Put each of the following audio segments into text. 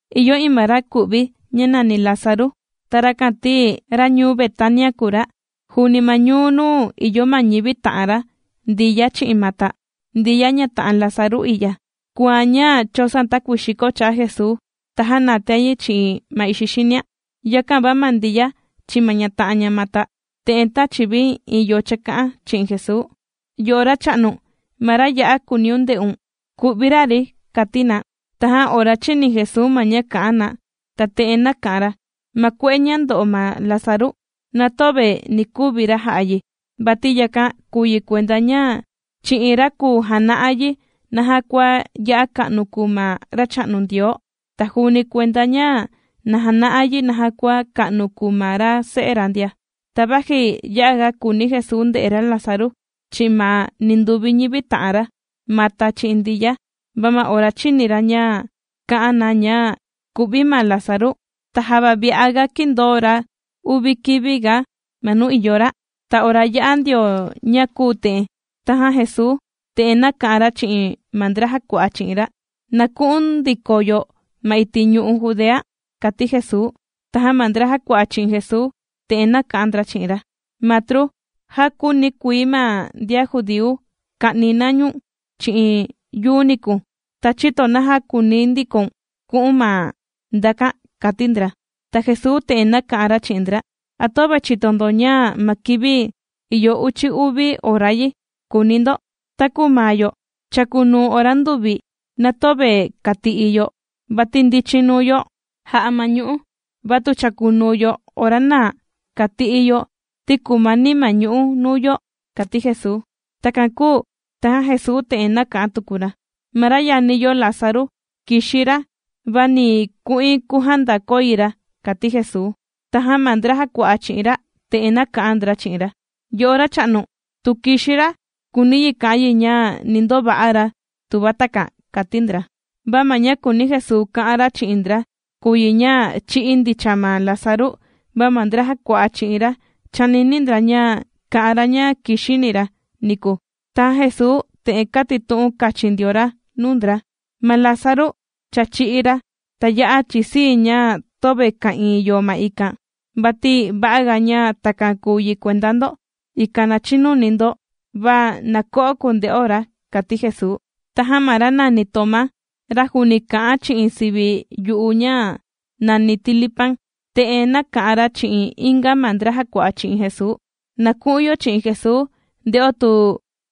Ìyo iin ma ra ku'vi, ña nàni Lázaru. Ta rakan ti, ra ñuu Betania kùu ra, juuni ma ñuu nuu ìyo ma ñivi ta'an ra Ndiya chi'in Mata. Ndiya ña ta'an Lázaru i'ya, kùan ña chōsoan takuii xiko cha'a Jesuu, ta jānatian yi chi'in ma ixi xinia. Yakan va ma Ndiya chi'in ma ña ta'an ña Mata, te'en tāchi vi iin yo chāka'an chi'in Jesuu: ―Yo'o racha'nu, ma ra ya'a kùuniun nde'un, kù'vi ra, ri ―kàti na. Tajan ora chīni Jesuu ma ña kā'an na, ta te'en nāka'an ra: ―Ma kue'e ña ndo'o ma Lázaru, na töve ni kuvi ra ja'a yi, vati yakan kùu yi kuenda ña chi'in ra kùu jana'a yi naja kua ya'a ka'nu kùu ma Racha'nu Ndioo, ta juuni kuenda ña na jana'a yi naja kua ka'nu kùu ma ra Se'e ra ndia. Ta vaji ya'a ga kùuni Jesuu nde'e ra Lázaru, chi'in ma ninduvi ñivi ta'an ra: Mata chi'in Ndiya, va ma ora chīni ra ña kā'an na ña ku'vi ma Lázaru, ta java vi'a ga kīndoo ra uvi kivi ga ma nuu ìyo ra. Ta ora yā'a ndio ña kūu te'en, tajan Jesuu te'en nāka'an ra chi'in ma ndra jàkua'a chi'in ra: ―Na ku'un ndiko yo ma iti' ñu'u' Judea ―kàti Jesuu. Tajan ma ndra jàkua'a chi'in Jesuu te'en nāka'an ndra chi'in ra: ―Matru, já kūuni kuii ma ndian judíu ka'ni na ñu̱n chi'in yuu niku. ¿Ta chïto naja kùuni ndikoun ku'u̱n ma ndakan? ―kàti ndra. Ta Jesuu te'en nāka'an ra chi'in ndra: ―¿A töve chìto ndo ña ma kivi, ìyo uchi uvi ora yi?, kùuni ndo. Taku ma yo chàkunuu ora nduvi, na töve kàti'i yo, vati ndichin nuu yo jà'a ma ñu'ú. Va tu chàkunuu yo ora naa, kàti'i yo ti kumani ma ñu'ú nuu yo ―kàti Jesuu. Takan kūu tajan Jesuu te'en nāka'an tuku ra: ―Ma ra yani yo Lázaru kìxi ra, va ni ku'in kujandakoi ra ―kàti Jesuu. Tajan ma ndra jàkua'a chi'in ra, te'en nāka'an ndra chi'in ra: ―Yo'o Racha'nu, tu kìxi ra, kùuni yi ka'an yi ña ni ndova'a ra tuva takan ―kàti ndra. Va ma ña kūuni Jesuu ka'an ra chi'in ndra, kùu yi ña chī'í ndicha ma Lázaru, va ma ndra jàkua'a chi'in ra chānini ndra ña kà'an ra ña kìxini ra niku. Tajan Jesuu te'en kātitu'un kachin ndio ra nuu ndra: ―Ma Lázaru cha chī'í ra. Ta ya'a chisii̱ ña töve ka'ìin yo ma ikan, vati va'aga ña takan kūu yi kuenda ndo, ikan na chinuni ndo. Va na ko'o kunde'o ra ―kàti Jesuu. Tajan ma ra nàni Tomá, ra juuni kà'an chi'in sivi yu'u ña nàni Tilipan, te'en nāka'an ra chi'in inga ma ndra jàkua'a chi'in Jesuu: ―Na ku'un yo chi'in Jesuu, nde'o tu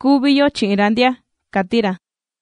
kuvi yo chi'in ra ndia ―kàti ra.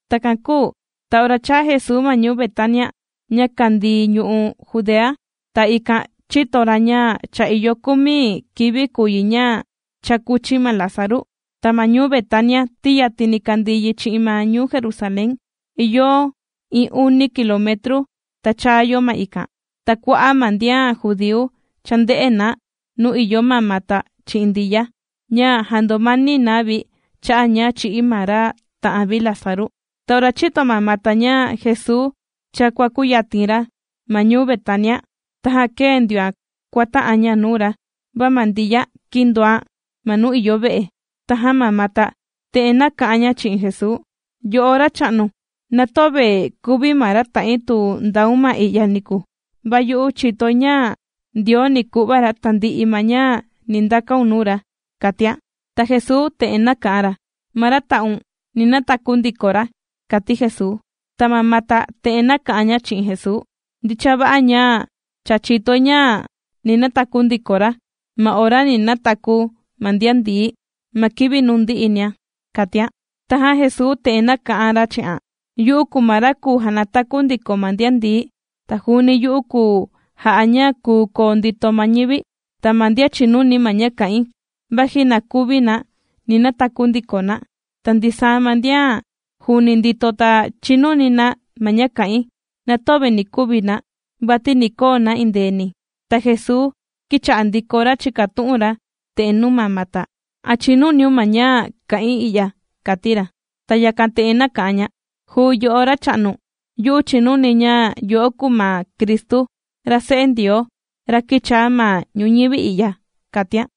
Takan kūu ta ora chāa Jesuu ma ñuu Betania ña kàndii ñu'u' Judea, ta ikan chīto ra ña cha ìyo kumi kivi kùu yi ña cha kūchi ma Lázaru. Ta ma ñuu Betania ti yatini kàndii yi chi'in ma ñuu Jerusalén, ìyo iin uni kilometru, ta chaa yo ma ikan. Ta kua'a' ma ndian judíu chānde'e na nuu ìyo ma Mata chi'in Ndiya, ña jàndomani na vi cha'a' ña chī'í ma ra ta'an vi Lázaru. Ta ora chīto ma Mata ña Jesuu cha kuàkuyatin ra ma ñuu Betania, tajan kēe ndioan kuàta'an ña nuu ra, va ma Ndiya kīndoan ma nuu ìyo ve'e. Tajan ma Mata te'en nāka'an ña chi'in Jesuu: ―Yo'o Racha'nu, na töve kuvi ma ra ta'in tu ndaun ma i'ya niku. Va yu'u chìtoi ña Ndioo ni ku'va ra tandi'i ma ña ni ndakaun nuu ra ―kàtian. Ta Jesuu te'en nāka'an ra: ―Ma ra ta'un, ni nataku ndiko ra ―kàti Jesuu. Ta ma Mata te'en nāka'an ña chi'in Jesuu: ―Ndicha va'a ña cha chìtoi ña ni nataku ndiko ra, ma ora ni nataku ma ndian ndií, ma kivi nuu ndi'i nia ―kàtian. Tajan Jesuu te'en nāka'an ra chi'an: ―Yu'u kùu ma ra kùu janataku ndiko ma ndian ndií, ta juuni yu'u kùu ja'a ña kùu koo ndito ma ñivi. Ta ma ndian chìnuni ma ña kà'in, vaji na kuvi na, ni nataku ndiko na. Ta ndisaa ma ndian juuni ndito ta chìnuni na ma ña kà'in, na töve ni kuvi na, vati ni koo na endeeni. Ta Jesuu kīcha'a ndiko ra chìkatu'un ra te'en nuu ma Mata: ―¿A chìnuniun ma ña kà'in i'ya? ―kàti ra. Ta yakan te'en nāka'an ña: ―Juu yo'o Racha'nu, yu'u chìnuni ña yo'o kuu ma Cristu ra Se'e Ndioo, ra kīchaa ma ñuñivi i'ya ―kàtian.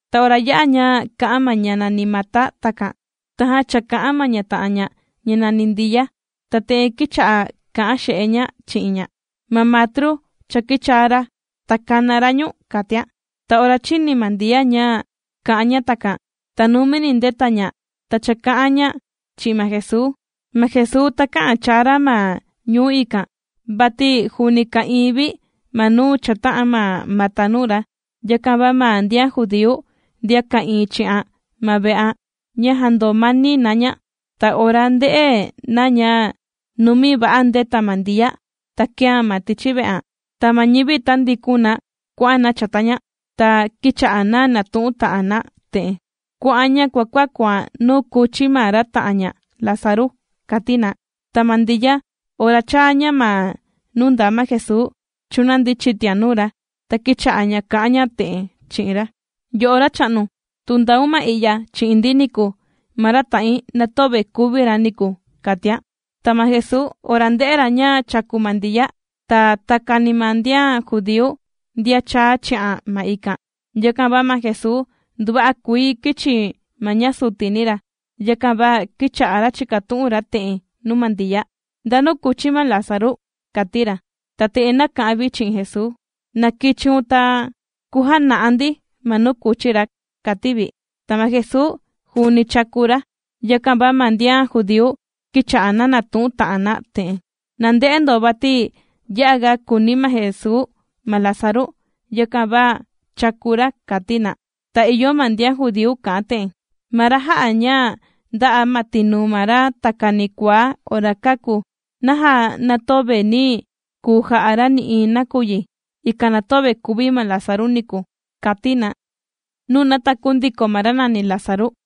Ta ora ya'a ña kā'an ma ña nàni Mata takan, tajan chāka'an ma ña ta'an ña ña nàni Ndiya, ta te'en kīcha'a kà'an xe'e ña chi'in ña: ―Ma matru cha kīchaa ra, ta kàna ra ñu̱n ―kàtian. Ta ora chīni ma Ndiya ña kà'an ña takan, ta numini ndēta ña, ta chāka'an ña chi'in ma Jesuu. Ma Jesuu takä'an chaa ra ma ñuu ikan, vati juuni ka'ìin vi ma nuu chāta'an ma Mata nuu ra. Yakan va ma ndian judíu ndian ka'ìin chi'an ma ve'an, ña jàndomani na ña, ta ora ndē'e na ña numi va'a ndēta ma Ndiya, ta kēan ma tichi ve'an, ta ma ñivi tāndikun na kuà'an na chata ña, ta kīcha'a na nàtu'un ta'an na te'en: ―¡Kuà'an ña kuàkuakuan nuu kūchi ma ra ta'an ña Lázaru! ―kàti na. Ta ma Ndiya ora chāa ña ma nuu ndaa ma Jesuu, chūnandi chitian nuu ra, ta kīcha'a ña kà'an ña te'en chi'in ra: ―Yo'o Racha'nu, tu ndaun ma i'ya chi'in ndi niku, ma ra ta'in na töve kuvi ra niku ―kàtian. Ta ma Jesuu ora ndē'e ra ña chàku ma Ndiya, ta takani ma ndian judíu, ndian chāa chi'an ma ikan, yakan va ma Jesuu nduva'a kuii kīchi ma ña sutini ra. Yakan va kīcha'a ra chìkatu'un ra te'en nuu ma Ndiya: ―¿Ndanu kūchi ma Lázaru? ―kàti ra. Ta te'en nāka'an vi chi'in Jesuu: ―Na kichiun ta kujana'a ndi ma nuu kūchi ra ―kàti vi. Ta ma Jesuu juuni chāku ra. Yakan va ma ndian judíu kīcha'a na nàtu'un ta'an na te'en: ―¡Na nde'e ndo vati ya'a ga kùuni ma Jesuu ma Lázaru, yakan va chàku ra! ―kàti na. Ta ìyo ma ndian judíu kà'an te'en: ―Ma ra jā'a ña ndā'a ma tinuu ma ra takani kuaá ora kāku, ¿naja na töve nī kuu ja'a ra nï'iin nakuyi, ikan na töve kuvi ma Lázaru niku? ―kàti na. Nuu nàtaku ndiko ma ra nàni Lázaru.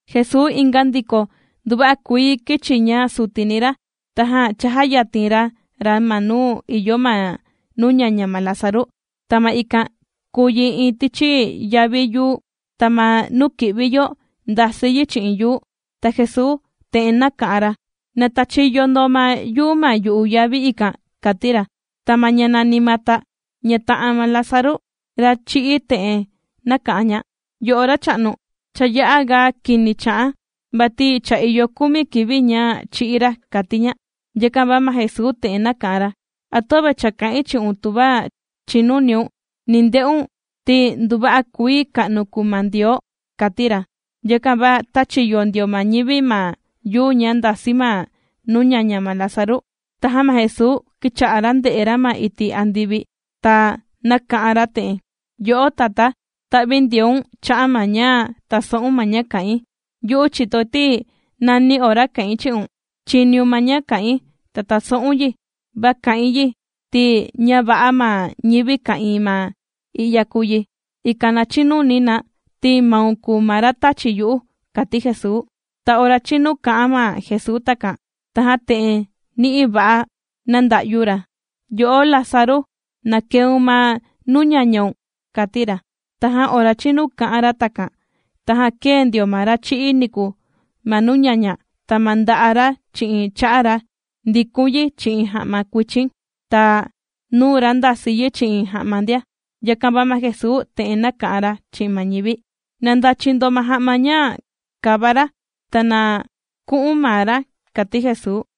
Jesuu inga ndiko, nduva'a kuii kīchi ña sutini ra, tajan chājayatin ra ra ma nuu ìyo ma nuu ñaña ma Lázaru. Ta ma ikan kùu yi iin tichi yavi yuu, ta ma nuu kì'vi yo ndàsi yi chi'in yuu. Ta Jesuu te'en nāka'an ra: ―Na tachiyo ndo ma yuu ma yu'u yavi ikan ―kàti ra. Ta ma ña nàni Mata ña ta'an ma Lázaru ra chī'í te'en nāka'an ña: ―Yo'o Racha'nu, cha ya'a ga kini cha'an, vati cha ìyo kumi kivi ña chī'í ra ―kàti ña. Yakan va ma Jesuu te'en nāka'an ra: ―¿A töve cha kā'in chi'un, tuva chìnuniun, ni nde'un ti nduva'a kuii ka'nu kùu ma Ndioo? ―kàti ra. Yakan va tāchi yo ndio ma ñivi ma yuu ña ndàsi ma nuu ñaña ma Lázaru, tajan ma Jesuu kīcha'a ra ndè'e ra ma iti' andivi ta nāka'an ra te'en: ―Yo'o Tatá, ta'vindioun cha'a' ma ña tàso'un ma ña kà'in. Yu'u chìtoi ti nani ora kà'in chi'un, chìniun ma ña kà'in, ta tàso'un yi, va kà'in yi ti ña va'a ma ñivi ka'ìin ma i'ya kùu yi, ikan na chinuni na ti maun kùu ma ra tāchi yu'u ―kàti Jesuu. Ta ora chīnu kā'an ma Jesuu takan, tajan te'en ni'i va'a nānda'yu ra: ―Yo'o Lázaru, ¡na keun ma nuu ñañaun! ―kàti ra. Tajan ora chīnu kā'an ra takan, tajan kēe ndio ma ra chī'í niku ma nuu ñaña, ta ma nda'a' ra chi'in cha'a ra ndikun yi chi'in ja'ma kuichin, ta nuu ra ndasi yi chi'in ja'ma ndia. Yakan va ma Jesuu te'en nāka'an ra chi'in ma ñivi: ―Na ndachi ndo ma ja'ma ña kàva ra, ta na ku'un maa ra ―kàti Jesuu.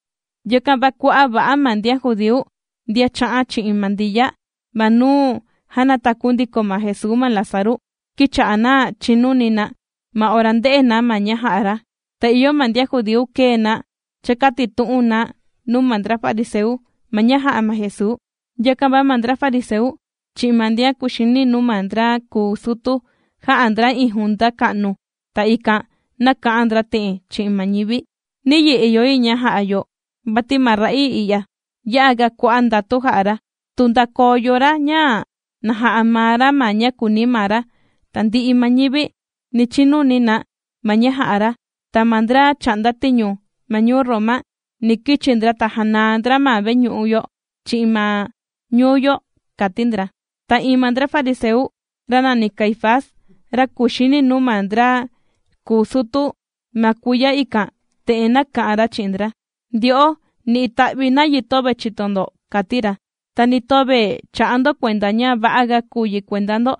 Yakan va kua'a' va'a ma ndian judíu ndian chā'an chi'in ma Ndiya ma nuu jānataku ndiko ma Jesuu ma Lázaru, kīcha'a na chìnuni na, ma ora ndē'e na ma ña jā'a ra. Ta ìyo ma ndian judíu kēe na chàkatitu'un na nuu ma ndra fariseu ma ña jā'a ma Jesuu. Yakan va ma ndra fariseu chi'in ma ndian kuxini nuu ma ndra kùu sutu, jā'a ndra iin junta ka'nu, ta ikan nāka'an ndra te'en chi'in ma ñivi: ―¿Niyi ìyo yi ña ja'a yo? Vati ma ra'ii i'ya, ya'a ga kua'a' ndatu jà'a ra. Tu ndakoo yo ra ña na ja'a maa ra ma ña kùuni ra, tandi'i ma ñivi ni chinuni na ma ña jà'a ra, ta ma ndra chà'nda tiñu ma ñuu Roma ni kichi ndra ta janaa ndra ma veñu'u yo chi'in ma ñuu yo ―kàti ndra. Ta iin ma ndra fariseu, ra nàni Caifás, ra kuxini nuu ma ndra kuu sutu ma kuiya ikan, te'en nāka'an ra chi'in ndra: ―Ndyo'o, ni ita'vi nayi töve chìto ndo ―kàti ra―. Ta ni töve chà'a ndo kuenda ña va'aga kùu yi kuenda ndo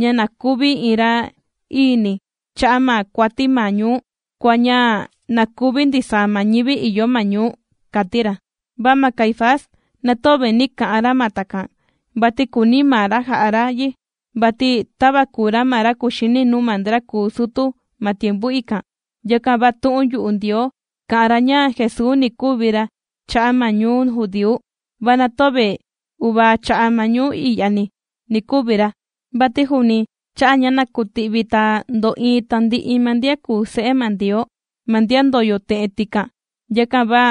ña na kuvi iin ra'iini cha'a' ma kuati ma ñuu, kua ña na kuvi ndisaa ma ñivi ìyo ma ñuu ―kàti ra. Va ma Caifás na töve nī ka'an ra ma takan, vati kùuni maa ra ja'a ra yi, vati tava kùu ra ma ra kuxini nuu ma ndra kùu sutu ma tiempu ikan, yakan va tu'un yu'u Ndioo kā'an ra ña Jesuu ni kuvi ra cha'a' ma ñuu judíu. Va na töve uvaa cha'a' ma ñuu i'yani ni kuvi ra, vati juuni cha'a' ña na kuti'vi ta ndo'iin tandi'i ma ndian kùu se'e ma Ndioo, ma ndian ndòyo te'en, tikan. Yakan va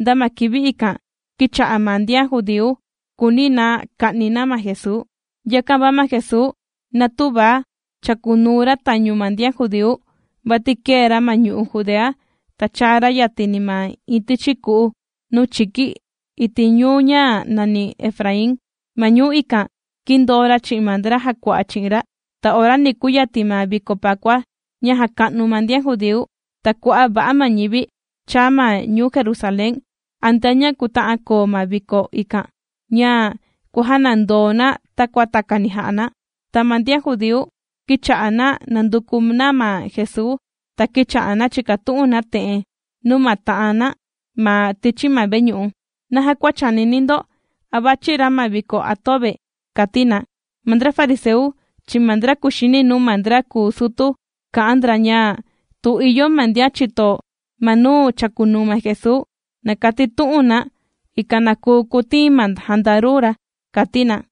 nda ma kivi ikan, kīcha'a ma ndian judíu kùuni na ka'ni na ma Jesuu. Yakan va ma Jesuu na tüva chàkunuu ra tañu ma ndian judíu, vati kēe ra ma ñu'u' Judea, ta chàa ra yatini ma iin tichi ku'u nuu chiki iti' ñuu ña nàni Efraín. Ma ñuu ikan kīndoo ra chi'in ma ndra jàkua'a chi'in ra. Ta ora ni kuyatin ma viko pakua ña jàka'nu ma ndian judíu, ta kua'a' va'a ma ñivi chàa ma ñuu Jerusalén antea ña kuta'an koo ma viko ikan, ña kuàjanandoo na takua takani jà'a na. Ta ma ndian judíu kīcha'a na nànduku na ma Jesuu, ta kīcha'a na chìkatu'un na te'en nuu ma ta'an na ma tichi ma veñu'u: ―¿Naja kua chànini ndo, a vàchi ra ma viko a töve? ―kàti na. Ma ndra fariseu chi'in ma ndra kùxini nuu ma ndra kuu sutu kā'an ndra ña, tu ìyo ma ndian chìto ma nuu chàkunuu ma Jesuu, na katitu'un na, ikan na kuu kutiin ma jandaru ra, kàti na.